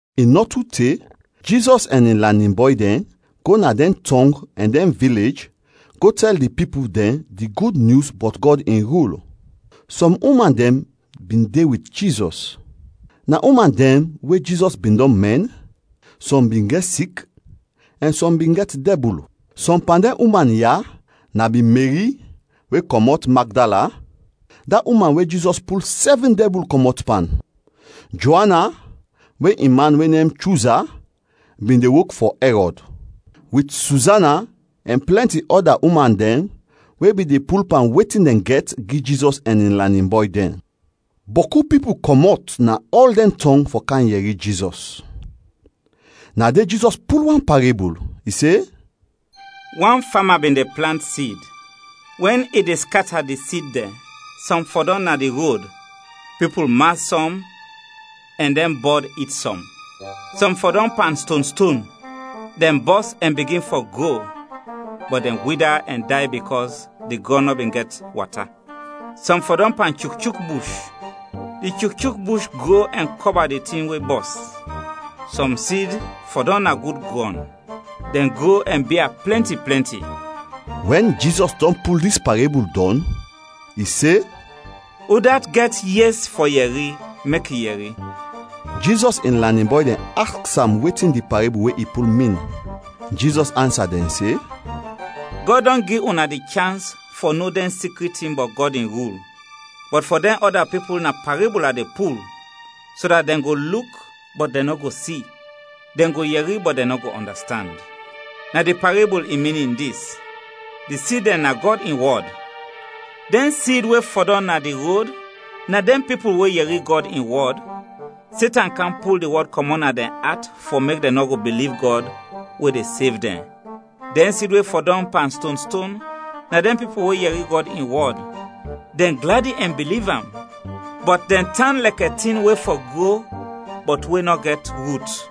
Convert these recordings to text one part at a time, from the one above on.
I nɔ tu te, Jizɔs ɛn in lanin bɔy dɛn go na dɛn tɔng ɛn dɛn vilej go tɛl di pipul dɛn di Gud Nyus bɔt Gɔd in rul. Sɔm uman dɛn bin de wit Jizɔs; na uman dɛn we Jizɔs bin dɔn mɛn, sɔm bin sik ɛn sɔm bin gɛt dɛbul. Sɔm pan dɛn uman ya na bin Meri we kɔmɔt Magdala, da uman we Jizɔs pul sɛvin dɛbul kɔmɔt pan; Joana, we in man we nem Chuza, bin de wok fɔ Ɛrɔd; wit Suzana ɛn plɛnti ɔda uman dɛn we bin de pul pan wetin dɛn gɛt gi Jizɔs ɛn in lanin bɔy dɛn. Bɔku pipul kɔmɔt na ɔl dɛn tɔng fɔ kam yɛri Jizɔs. Na de Jizɔs pul wan parebul, i se: “Wan fama bin de plant sid. Wɛn i de skata di sid dɛn, sɔm fɔdɔm na di rod; pipul mas sɔm ɛn dɛn bɔd it sɔm. Sɔm fɔdɔm pan stonston. Dɛn bɔs ɛn bigin fɔ gro bɔt dɛn wida ɛn day bikɔs di grɔn nɔ bin gɛt wata. Sɔm fɔdɔm pan chukchuk bush. Di chukchuk bush gro ɛn kɔba di tin we bɔs. Sɔm sid fɔdɔm na gud grɔn, dɛn gro ɛn bia plɛnti plɛnti.” Wɛn Jizɔs dɔn pul dis parebul dɔn, i se, “Udat gɛt yes fɔ yɛri, mek i yɛri.” Jizɔs in lanin bɔy dɛn aks am wetin di parebul we i pul, min. Jizɔs ansa dɛn se, “Gɔd dɔn gi una di chans fɔ no dɛn sikrit tin bɔt Gɔd in rul, bɔt fɔ dɛn ɔda pipul na parebul a de pul, so dat dɛn go luk bɔt dɛn nɔ go si; dɛn go yɛri, bɔt dɛn nɔ go ɔndastand. “Na di parebul in minin dis: Di sid dɛn na Gɔd in wɔd. Dɛn sid we fɔdɔm na di rod na dɛn pipul we yɛri Gɔd in wɔd; Setan kam pul di wɔd kɔmɔt na dɛn at fɔ mek dɛn nɔ go biliv Gɔd we de sev dɛn. Dɛn sid we fɔdɔm pan stonston na dɛn pipul we yɛri Gɔd in wɔd; dɛn gladi ɛn biliv am, bɔt dɛn tan lɛkɛ tin we fɔ gro bɔt we nɔ gɛt rut;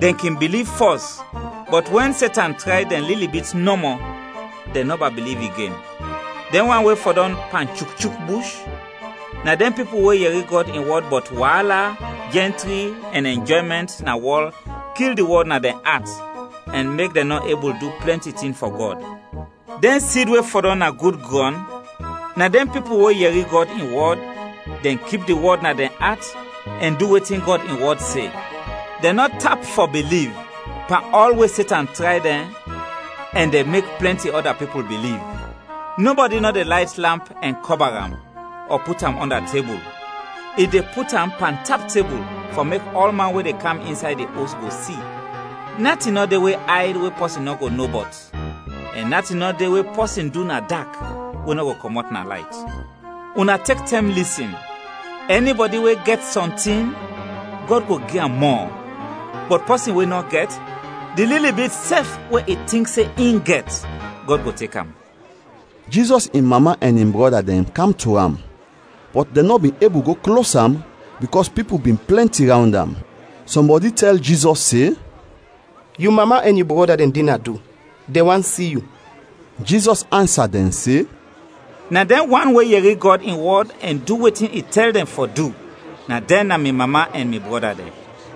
dɛn kin biliv fɔs, bɔt wɛn Setan tray dɛn lili bit nɔmɔ, dɛn nɔba biliv igen. Dɛn wan we fɔdɔm pan chukchuk bush na dɛn pipul we yɛri Gɔd in wɔd bɔt waala, jɛntri, ɛn ɛnjɔymɛnt na wɔl kil di wɔd na dɛn at ɛn mek dɛn nɔ ebul du plɛnti tin fɔ Gɔd. Dɛn sid we fɔdɔm na gud grɔn na dɛn pipul we yɛri Gɔd in wɔd; dɛn kip di wɔd na dɛn at ɛn du wetin Gɔd in wɔd se. Dɛn nɔ tap fɔ biliv pan ɔl we Setan tray dɛn ɛn dɛn mek plɛnti ɔda pipul biliv. “Nɔbɔdi nɔ de layt lamp ɛn kɔba am ɔ put am ɔnda tebul. I de put am pantap tebul fɔ mek ɔlman we de kam insay di os go si. “Natin nɔ de we ayd we pɔsin nɔ go no bɔt ɛn natin nɔ de we pɔsin du na dak, we nɔ go kɔmɔt na layt. “Una tek tɛm lisin. Ɛnibɔdi we gɛt sɔntin, Gɔd go gi am mɔ; bɔt pɔsin we nɔ gɛt, di lili bit sɛf we i tink se in gɛt, Gɔd go tek am.” Jizɔs in mama ɛn in brɔda dɛn kam to am bɔt dɛn nɔ bin ebul go klos am bikɔs pipul bin plɛnti rawnd am. Sɔmbɔdi tɛl Jizɔs se, “Yu mama ɛn yu brɔda dɛn de na do, dɛn want si yu.” Jizɔs ansa dɛn se, “Na dɛn wan we yɛri Gɔd in wɔd ɛn du wetin i tɛl dɛn fɔ du, na dɛn na mi mama ɛn mi brɔda dɛn.”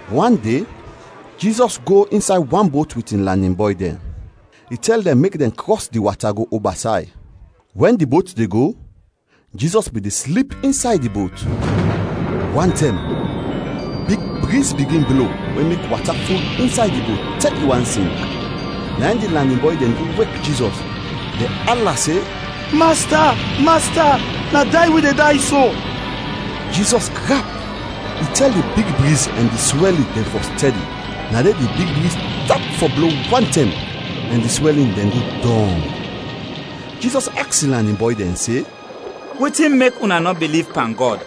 Wan de, Jizɔs go insay wan bot wit in lanin bɔy dɛn. I tɛl dɛn mek dɛn krɔs di wata go oba say. Wɛn di bot de go, Jizɔs bin de slip insay di bot. Wantɛm, big briz bigin blo we mek wata ful insay di bot te i want sink. Na in di lanin bɔy dɛn go wek Jizɔs. Dɛn ala se, “Masta, Masta, na day wi de day so!” Jizɔs grap, i tɛl di big briz ɛn di swɛlin dɛn fɔ stɛdi; na de di briz tap fɔ blo wantɛm ɛn di swɛlin dɛn go dɔng. Jizɔs aks in lanin bɔy dɛn se, “Wetin mek una nɔ biliv pan Gɔd?”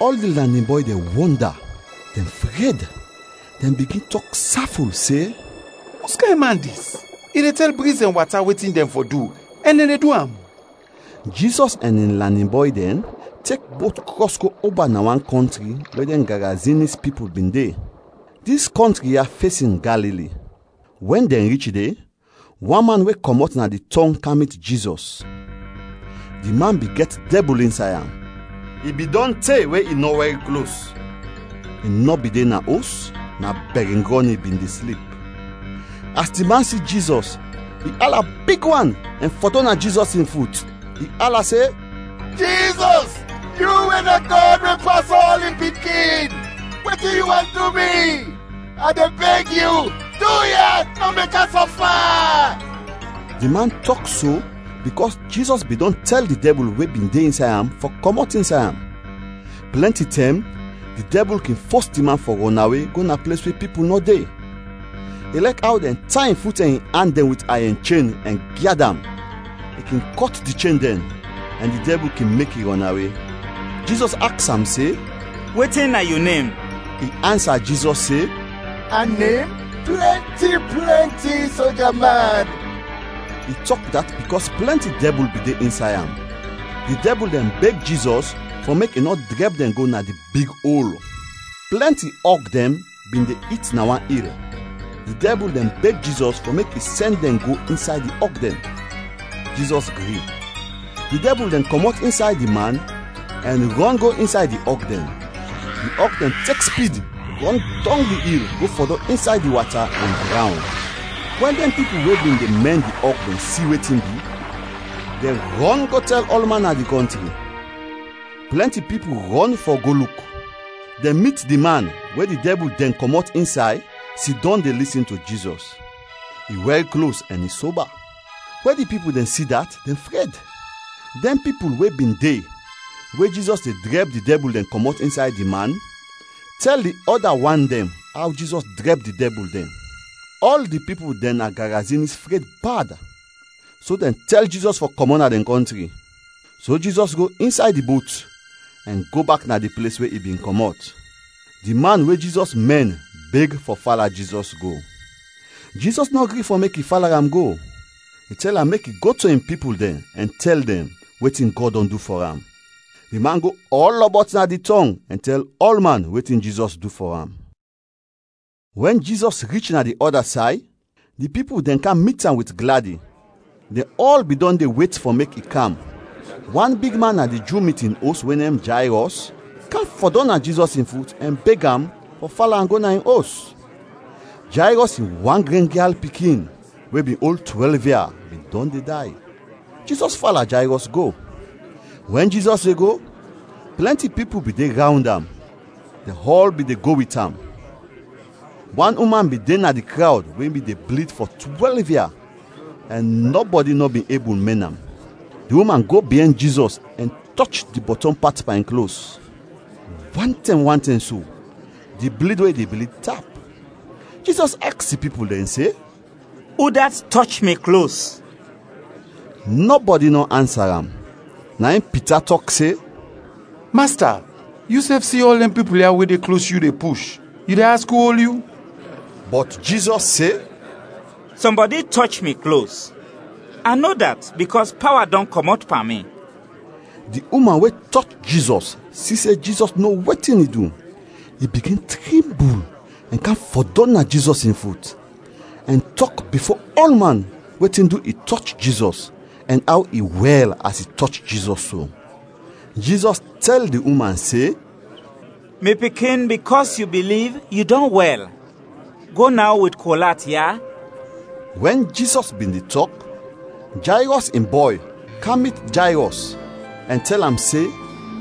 Ɔl di lanin bɔy dɛn wɔnda, dɛn fred, dɛn bigin tɔk saful se, “Uskayn man dis? I de tɛl briz ɛn wata wetin dɛn fɔ du ɛn dɛn de du am!” Jizɔs ɛn in lanin bɔy dɛn tek bot krɔs go oba na wan kɔntri we dɛn Garazinis pipul bin de. Dis kɔntri ya fesin Galili. Wɛn dɛn rich de, wan man we kɔmɔt na di tɔng kam mit Jizɔs. Di man bin gɛt dɛbul insay am. I bin dɔn te we i nɔ wɛr klos. I nɔ bin de na os, na bɛringrɔn i bin de slip. As di man si Jizɔs, i ala big wan ɛn fɔdɔm na Jizɔs in fut. I ala se, “Jizɔs, yu we na Gɔd we pas ɔl, in Pikin, wetin yu want du mi? A de beg yu, duya, nɔ mek a sɔfa!” Di man tɔk so bikɔs Jizɔs bin dɔn tɛl di dɛbul we bin de insay am fɔ kɔmɔt insay am. Plɛnti tɛm di dɛbul kin fos di man fɔ rɔnawe go na ples we pipul nɔ de. Ilɛk aw dɛn tay in fut ɛn in an dɛn wit ayɛn chen ɛn gyad am, i kin kɔt di chen dɛn ɛn di dɛbul kin mek i rɔnawe. Jizɔs aks am se, “Wetin na yu nem?” I ansa Jizɔs se, “A nem Plɛnti, Plɛnti Soja man;” i tɔk dat bikɔs plɛnti dɛbul bin de insay am. Di dɛbul dɛn beg Jizɔs fɔ mek i nɔ drɛb dɛn go na di Big Ol. Plɛnti ɔg dɛn bin de it na wan il, di dɛbul dɛn beg Jizɔs fɔ mek i sɛn dɛn go insay di ɔg dɛn; Jizɔs gri. Di dɛbul dɛn kɔmɔt insay di man ɛn rɔn go insay di ɔg dɛn. Di ɔg dɛn tek spid rɔn dɔng di il go fɔdɔm insay di wata ɛn drawn. Wɛn dɛn pipul we bin de mɛn di ɔg dɛn si wetin bi, dɛn rɔn go tɛl ɔlman na di kɔntri. Plɛnti pipul rɔn go fɔ go luk. Dɛn mit di man we di dɛbul dɛn kɔmɔt insay sidɔm de lisin to Jizɔs. I wɛr klos ɛn i soba. We di pipul dɛn si dat, dɛn fred. Dɛn pipul we bin de we Jizɔs de drɛb di dɛbul dɛn kɔmɔt insay di man, tɛl di ɔda wan dɛn aw Jizɔs drɛb di dɛbul dɛn. Ɔl di pipul dɛn na Garazinis fred bad, so dɛn tɛl Jizɔs fɔ kɔmɔt na dɛn kɔntri. So Jizɔs go insay di bot ɛn go bak na di ples we i bin kɔmɔt. Di man we Jizɔs mɛn beg fɔ fala Jizɔs go. Jizɔs nɔ gri fɔ mek i fala am go. I tɛl am mek i go to in pipul dɛn ɛn tɛl dɛn wetin Gɔd dɔn du fɔ am. Di man go ɔlɔbɔt na di tɔng ɛn tɛl ɔlman wetin Jizɔs du fɔ am. Wɛn Jizɔs rich na di ɔda say, di pipul dɛn kam mit am wit gladi. Dɛn ɔl bin dɔn de wet fɔ mek i kam. Wan bigman na di Ju mitin os we nem Jayrɔs, kam fɔdɔm na Jizɔs in fut ɛn beg am fɔ fala am go na in os. Jayrɔs in wan gren gyal pikin we bin ol twɛlv ia, bin dɔn de day. Jizɔs fala Jayrɔs go. Wɛn Jizɔs de go, plɛnti pipul bin de rawnd am, dɛn ɔl bin de go wit am. Wan uman bin de na di krawd we bin de blid fɔ twɛlv ia ɛn nɔbɔdi nɔ bin ebul mɛn am. Di uman go biɛn Jizɔs ɛn tɔch di bɔtɔm pat pan in klos. Wantɛm, wantɛm so, di blid we i de blid, tap. Jizɔs aks di pipul dɛn se, “Udat tɔch mi klos?” Nɔbɔdi nɔ ansa am. Na in Pita tɔk se, “Masta, yusɛf si ɔl dɛn pipul ya we de klos yu de push, yu de aks u ol yu?” Bɔt Jizɔs se, “Sɔmbɔdi tɔch mi klos. A no dat bikɔs pawa dɔn kɔmɔt pan mi!” Di uman we tɔch Jizɔs si se Jizɔs no wetin i du. I bigin trimbul ɛn kam fɔdɔm na Jizɔs in fut, ɛn tɔk bifo ɔlman wetin du i tɔch Jizɔs ɛn aw i wɛl as i tɔch Jizɔs so. Jizɔs tɛl di uman se, “Mi pikin, bikɔs yu biliv, yu dɔn wɛl. Go naw wit kol at, ya!” Wɛn Jizɔs bin de tɔk, Jayrɔs in bɔy kam mit Jayrɔs ɛn tɛl am se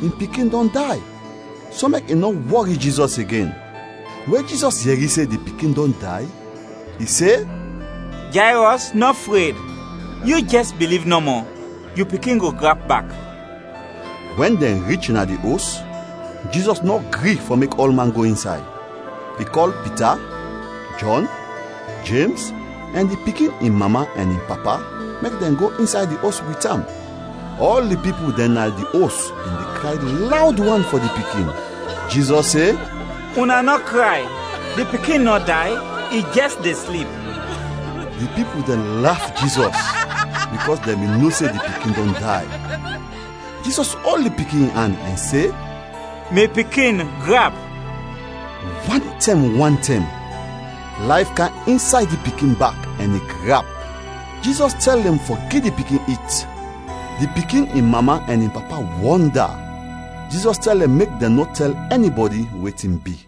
in pikin dɔn day so mek i nɔ wɔri Jizɔs igen. We Jizɔs yɛri se di pikin dɔn day, i se, “Jayrɔs, nɔ fred, yu jɛs biliv nɔmɔ, yu pikin go grap bak!” Wɛn dɛn rich na di os, Jizɔs nɔ gri fɔ mek ɔlman go insay; i kɔl Pita, Jɔn, Jems ɛn di pikin in mama ɛn in papa mek dɛn go insay di os wit am. Ɔl di pipul dɛn na di os bin de kray lawd wan fɔ di pikin. Jizɔs se, “Una nɔ kray, di pikin nɔ day, i jɛs de slip.” Di pipul dɛn laf Jizɔs bikɔs dɛn bin no se di pikin dɔn day. Jizɔs ol di pikin in an ɛn se, “Mi pikin, grap!” Wantɛm, wantɛm, layf kam insay di pikin bak ɛn i grap. Jizɔs tɛl dɛn fɔ gi di pikin it. Di pikin in mama ɛn in papa wɔnda! Jizɔs tɛl dɛn mek dɛn nɔ tɛl ɛnibɔdi wetin bi.